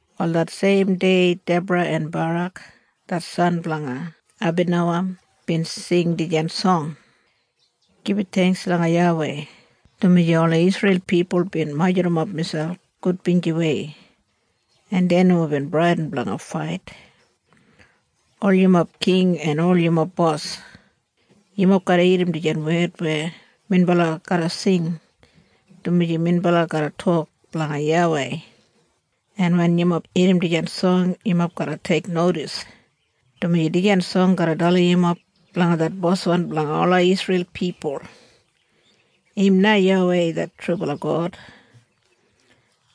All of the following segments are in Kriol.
Wal det seim dei Debra en Barak det san blanga Abinowam bin sing dijan song, Gibit theingks langa YAWEI, dumaji ola Isreil pipul bin majurrumap miselp gudbinjiwei, en dei nomo bin bradin blanga fait. Ol yumob king en ol yumob bos, yumob garra irrim dijan wed weya minbala garra sing, dumaji minbala garra tok blanga YAWEI, en wen yumob irrim dijan song, yumob garra teiknodis, dumaji dijan song garra dalim yumob blanga det boswan blanga ola Isreil pipul Im na YAWEI det trubala God.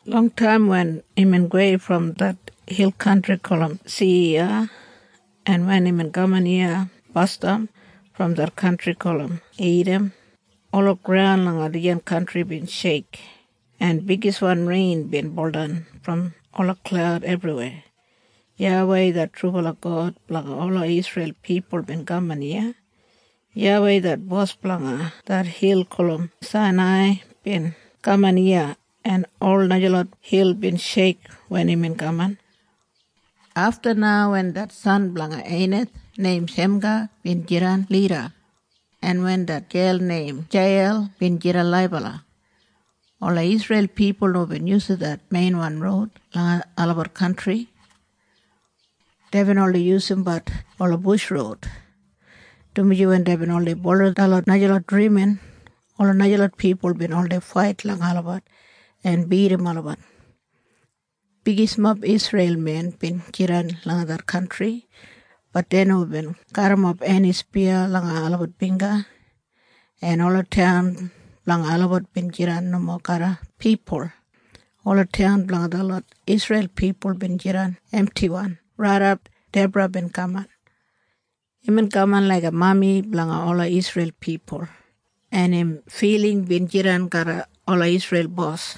Longtaim wen imbin gowei brom det hil kantri gulum Siyiya, en wen imbin kaman iya basdam brom det kantri gulum Idam, ola graun langa dijan kantri bin sheik, en bigiswan rein bin buldan brom ola klaud ebriweya. YAWEI det trubala God blanga ola Isreil pipul bin kaman iya. YAWEI det bos blanga det hil gulum Sainai bin kaman iya, en ola najalot hil bin sheik wen imbin kaman. Afta na wen det san blanga Einath neim Shemga bin jidan lida, en wen det gel neim Jeiyel bin jidan laibala, ola Isreil pipul nomo bin yusum det meinwan roud langa olabat kantri. Deibin oldei yusumbat ola bush roud, dumaji wen deibin oldei bulurrum detlot najalot drimin, ola najalot pipul bin oldei fait langa olabat en bidim olabat. Bigismob Isreil men bin jidan langa det kantri. Bat dei nomo bin garrimap eni spiya langa olabat bingga. En ola taun blanga olabat bin jidan nomo garram pipul. Ola taun blanga detlot Isreil pipul bin jidan emtiwan raidap Debra bin kaman. Imbin kaman laiga mami blanga ola Isreil pipul, en im filing bin jidan garram ola Isreil bos,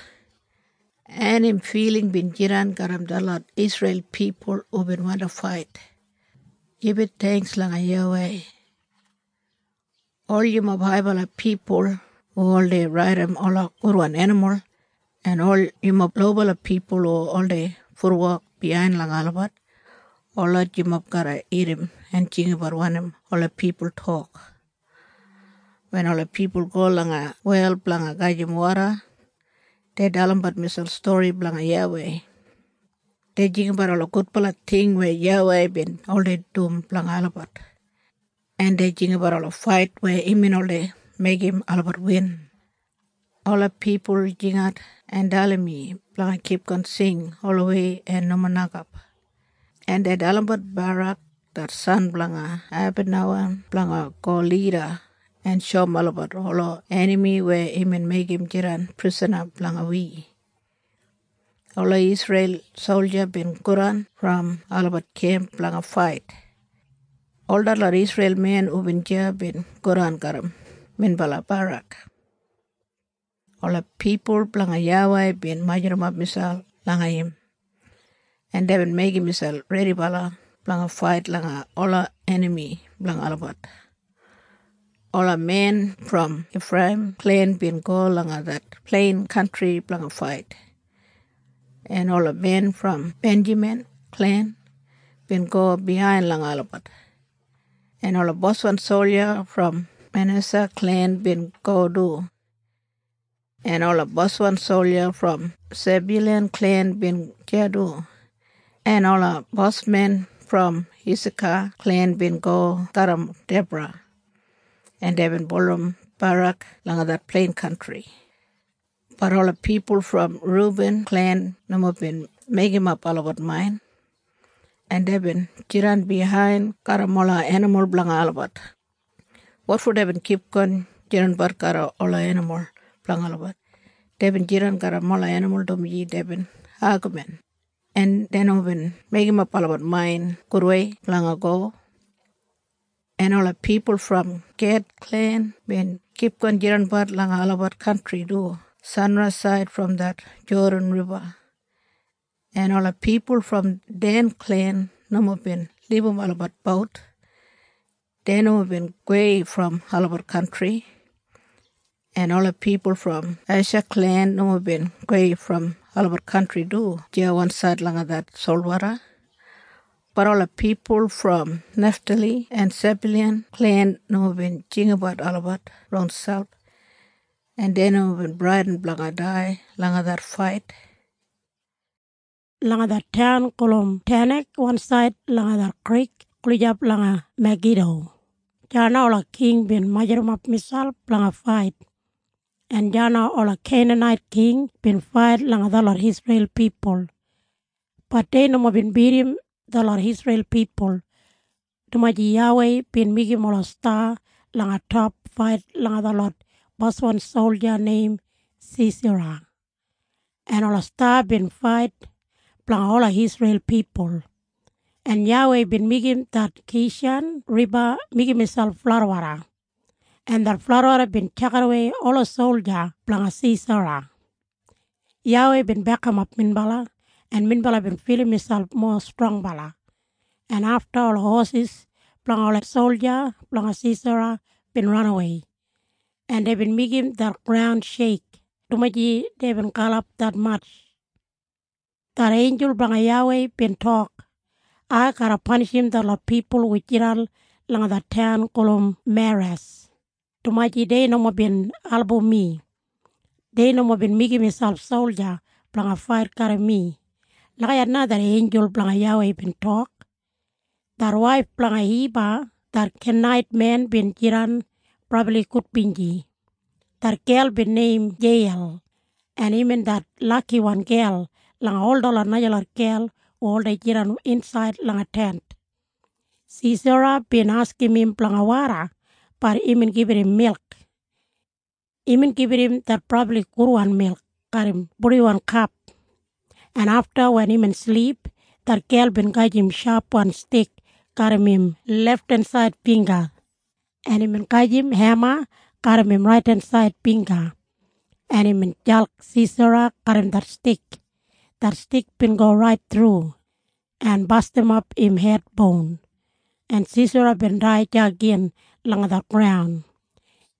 en im filing bin jidan garram detlot Isreil pipul hubin wandi fait. Gibit theingks langa YAWEI. Ol yumob haibala pipul hu oldei raidim ola gudwan enimul, en ol yumob lobala pipul hu oldei futwok biyain langa olabat, holot yumob garra irrim en jinggabat wanim ola pipul tok. Wen ola pipul go langa wel blanga gajim woda, dei dalimbat miselp stori blanga YAWEI. Dei jinggabat ola gudbala ting weya YAWEI bin oldei dum blanga olabat, en dei jinggabat ola fait weya imbin oldei meigim olabat win. Ola pipul jingat en dalim mi blanga kipgon sing olawei en nomo nokap, en dei dalimbat Barak det san blanga Abinowam blanga go lida en shoum olabat ola enami weya imbin meigim jidan prisana blanga wi. Ola Isreil solja bin godan brom olabat kemp blanga fait. Ol detlot Isreil men hubin deya bin godan garram minbala Barak. Ola pipul blanga YAWEI bin majurrumap miselp langa im, en deibin meigim miselp redibala blanga fait langa ola enami blanga olabat. Ola men brom Ifreiyim klen bin go langa det plein kantri blanga fait, en ola men brom Benjamin klen bin go biyain langa olabat, en ola boswan solja brom Manesa klen bin go du, en ola boswan solja brom Sebyulan klen bin deya du, en ola bosmen brom Isaka klen bin go garram Debra, en deibin bulurrum Barak langa det plein kantri. Bat ola pipul brom Rubin klen nomo bin meigimap olabat main, en deibin jidan biyain garram ola enimul blanga olabat. Wotfo deibin kipgon jidanbat garram ola enimul blanga olabat? Deibin jidan garram ola enimul dumaji deibin agamin, en dei nomo bin meigimap olabat main gudwei blanga go. En ola pipul brom Ged klen bin kipgon jidanbat langa olabat kantri du sanraisaid brom det Jodan Riba, En ola pipul brom Den klen nomo bin libum olabat bout. Dei nomo bin gowei brom olabat kantri. En ola pipul brom Esha klen nomo bin gowei brom olabat kantri du deya wansaid langa det solwoda. Bat ola pipul brom Neftali en Sebyulan klen nomo bin jinggabat olabat ronselp, en dei nomo bin bradin blanga dai langa det fait. Langa det taun gulum Tanak wansaid langa det krik gulijap langa Magido, deya na ola king bin majurrumap miselp blanga fait. En deya na ola Keinanait king bin fait langa detlot Isreil pipul. Bat dei nomo bin bidim detlot Isreil pipul, dumaji YAWEI bin meigim ola sta langa top fait langa detlot boswan solja neim Sisera, en ola sta bin fait blanga ola Isreil pipul, en YAWEI bin meigim det Kishan Riba meigim miselp fladwoda, en det fladwoda bin tjakidawei ola solja blanga Sisera. YAWEI bin bekimap minbala, en minbala bin filim miselp mowa strongbala, en afta ola hosis blanga ola solja blanga Sisera bin ranawei, en deibin meigim det graun sheik, dumaji deibin galap detmatj. Det einjul blanga YAWEI bin tok, ‘Ai garra panishim detlot pipul hu jidan langa det taun gulum Meras, dumaji dei nomo bin album mi. Dei nomo bin meigim miselp solja blanga fait garram mi.’ Lagijat na det einjul blanga YAWEI bin tok. Det waif blanga Hiba det Kenait men im jidan brabli gudbinji. Det gel bin neim Jeiyel, en imbin det lakiwan gel langa ol detlot najalot gel hu oldei jidan insaid langa tent. Sisera bin askim im blanga woda. Bat imbin gibit im milk. Imbin gibit im det brabli gudwan milk garram purdiwan kap, en afta wen imbin silip, det gel bin gajim shapwan stik garram im lefthensaid bingga, en imbin gajim hema garram im raidensaid bingga, en imbin jalk Sisera garram det stik. Det stik bin go rait thru, en bastimap im hed boun, en Sisera bin dai deya gin langa det graun.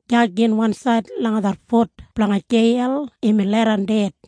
Deya gin wansaid langa det fut blanga Jeiyel imbin leidan ded.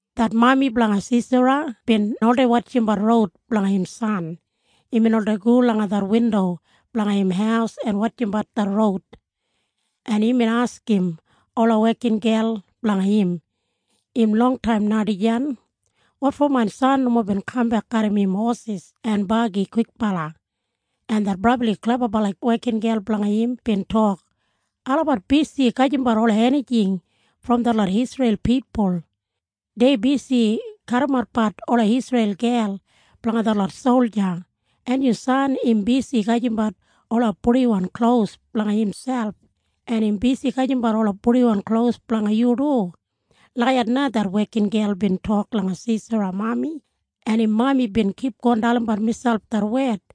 Det mami blanga Sisera bin oldei wotjimbat roud blanga im san. Imbin oldei go langa det windo blanga im haus en wotjimbat det roud, en imbin askim ola wekingel blanga im. “‘Im longtaim na dijan. Wotfo main san nomo bin kambek garram im hosis en bagi kwikbala?’” En det brabli klebabala wekingel blanga im bin tok, ‘Olabat bisi gajimbat ola enijing brom detlot Isreil pipul. Dei bisi kadimatbat ola Isreil gel blanga detlot solja, en yu san im bisi gajimbat ola purdiwan klos blanga imselp, en im bisi gajimbat ola purdiwan klos blanga yu du.’ Lagijat na det wekingel bin tok langa Sisera mami, en im mami bin kipgon dalimbat miselp det wed.